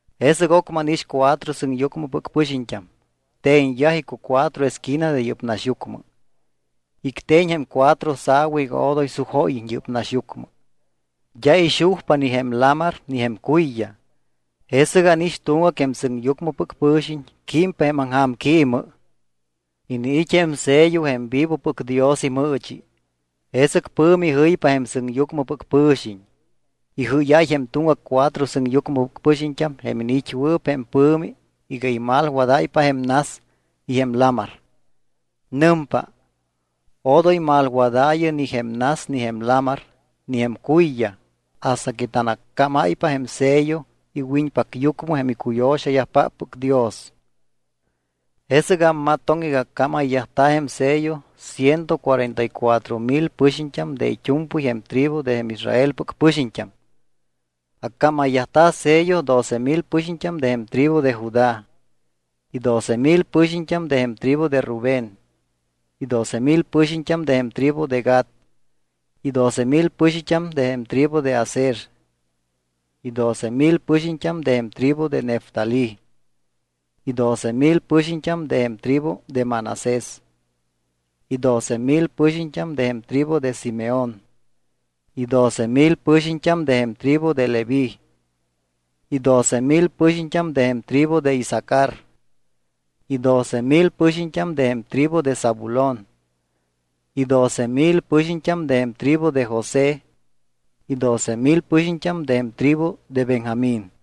Jesɨc ocmɨ ánix cuatro sɨŋyucmɨpɨc pɨxiñt́am te̱ñyaj icucuatro esquina de yɨ́p naxyucmɨ. Icte̱ñ jém cuatro sa̱wa iga odoy sujóyiñ yɨ́p naxyucmɨ. D́a ixujpa ni jém lamar ni jém cuyyaj. Jesɨc ánix tuŋgac jém sɨŋyucmɨpɨc pɨ̱xiñ químpa jém aŋja̱mquímmɨ. Iniit́ jém sello jém vivopɨc Dios imɨɨchi. Jesɨc pɨ̱mi jɨypa jém sɨŋyucmɨpɨc pɨ̱xiñ. Ijɨ́yáy jém tuŋgac cuatro sɨŋyucmɨpɨc pɨxiñt́am jém iniit́wɨɨp jém pɨ̱mi iga imalwadáypa jém nas y jém lamar. Nɨmpa: —Odoy malwadaayɨ ni jém nas ni jém lamar ni jém cuyyaj hasta que tanaccámáypa jém sello iwiñpacyucmɨ jém icuyo̱xayajpáppɨc Dios. Jesɨc ammatoŋ iga accámayyajta̱ jém sello ciento cuarenta y cuatro mil pɨxiñt́am de it́u̱mpɨy jém tribu de jém Israelpɨc pɨxiñt́am. Accámayyajta̱ sello doce mil pɨxiñt́am de jém tribu de Judá, y doce mil pɨxiñt́am de jém tribu de Rubén, y doce mil pɨxiñt́am de jém tribu de Gad, y doce mil pɨxiñt́am de jém tribu de Aser, y doce mil pɨxiñt́am de jém tribu de Neftalí, y doce mil pɨxiñt́am de jém tribu de Manasés, y doce mil pɨxiñt́am de jém tribu de Simeón, y doce mil pɨxiñt́am de jém tribu de Leví, y doce mil pɨxiñt́am de jém tribu de Isacar, y doce mil pɨxiñt́am de jém tribu de Zabulón, y doce mil pɨxiñt́am de jém tribu de José y doce mil pɨxiñt́am de jém tribu de Benjamín.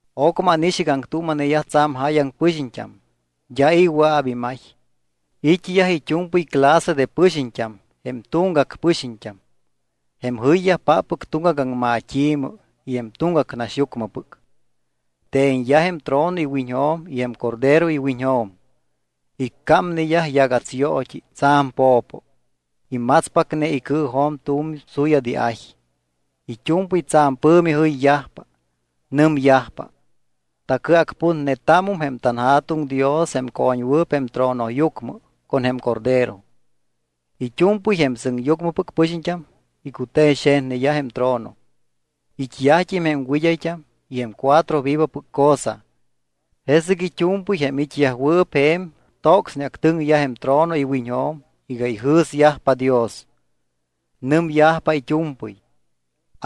Ocmɨ ánix iga aŋtuuma̱neyaj tsa̱m jáyaŋ pɨxiñt́am, d́a i̱ wɨa̱p imay. It́yaj it́u̱mpɨy clase de pɨxiñt́am, jém tuŋgac pɨxiñt́am, jém jɨyyajpáppɨc tuŋgac aŋmat́i̱mɨ y jém tuŋgac naxyucmɨpɨc. Te̱ñyaj jém trono iwiñjo̱m y jém Cordero iwiñjo̱m. Icámneyaj yagats yoot́i tsa̱m po̱po. Imatspacne icɨɨjo̱m tu̱m suyat iay. It́u̱mpɨy tsa̱m pɨ̱mi jɨyyajpa. Nɨmyajpa: Tacɨacputnetámum jém tanJa̱tuŋ Dios jém co̱ñwɨɨp jém tronoyucmɨ con jém Cordero. It́u̱mpɨy jém sɨŋyucmɨpɨc pɨxiñt́am icute̱ñxe̱tneyaj jém trono. It́yajt́im jém wɨd́ayt́am y jém cuatro vivopɨc cosa. Jesɨc it́u̱mpɨy jém it́yajwɨɨp je̱m tocsneactɨŋyaj jém trono iwiñjo̱m iga ijɨ̱syajpa Dios. Nɨmyajpa it́u̱mpɨy: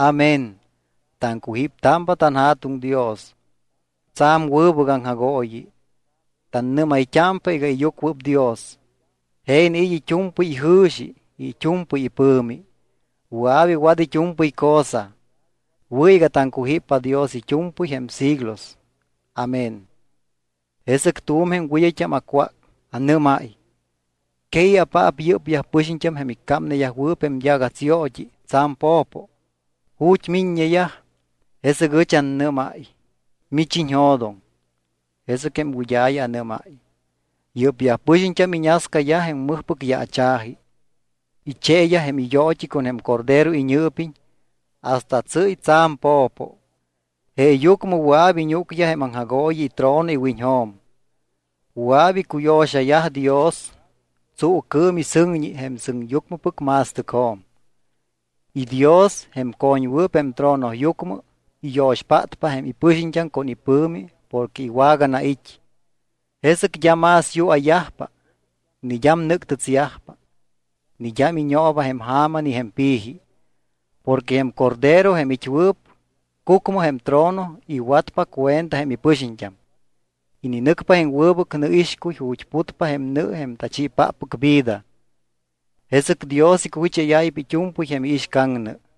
¡Amén! Taŋcujíptámpa tanJa̱tuŋ Dios. Tsa̱m wɨbɨc aŋjagooyi. Tannɨ́mayt́ámpa iga iyucuɨpdios. Je iniit́ it́u̱mpɨy ijɨ̱xi y it́u̱mpɨy ipɨ̱mi. Wɨa̱p iwat it́u̱mpɨy cosa. Wɨ̱ iga taŋcujíppa Dios it́u̱mpɨy jém siglos. Amén. Jesɨc tu̱m jém wɨd́ayt́am acwác. Anɨ́máy: —¿Que i̱apaap yɨ́pyaj pɨxiñt́am jém icámneyajwɨɨp jém yagatsyoot́i tsa̱m po̱po? ¿Ju̱t́ miññeyaj? Jesɨc ɨch annɨ́máy: —Mich iñjo̱doŋ. Jesɨc jém wɨd́a̱ya anɨ́máy: —Yɨ́pyaj pɨxiñt́am iñascayaj jém mɨjpɨc yaacha̱ji. Icheeyaj jém iyoot́i con jém Cordero iñɨɨpiñ hasta tsɨ́y tsa̱m po̱po. Jeeyucmɨ wɨa̱p iñúcyaj jém aŋjagooyi itrono iwiñjo̱m. Wɨa̱p icuyo̱xayaj Dios tsuucɨɨm y sɨŋñi jém sɨŋyucmɨpɨc ma̱stɨcjo̱m. Y Dios, jém co̱ññewɨɨp jém tronoyucmɨ, iyo̱xpátpa jém ipɨxiñt́am con ipɨ̱mi porque iwaganait́. Jesɨc d́a más yua̱yajpa ni d́am nɨ́ctɨtsyajpa ni d́am iñooba jém ja̱ma ni jém pi̱ji. Porque jém Cordero jém it́wɨɨp cucmɨ jém trono iwatpa cuenta jém ipɨxiñt́am. Ininɨcpa jém wɨbɨc nɨixcuy ju̱t́ putpa jém nɨ jém tachiipáppɨc vida. Jesɨc Dios icujicháyáypa it́u̱mpɨy jém iixcaŋnɨ.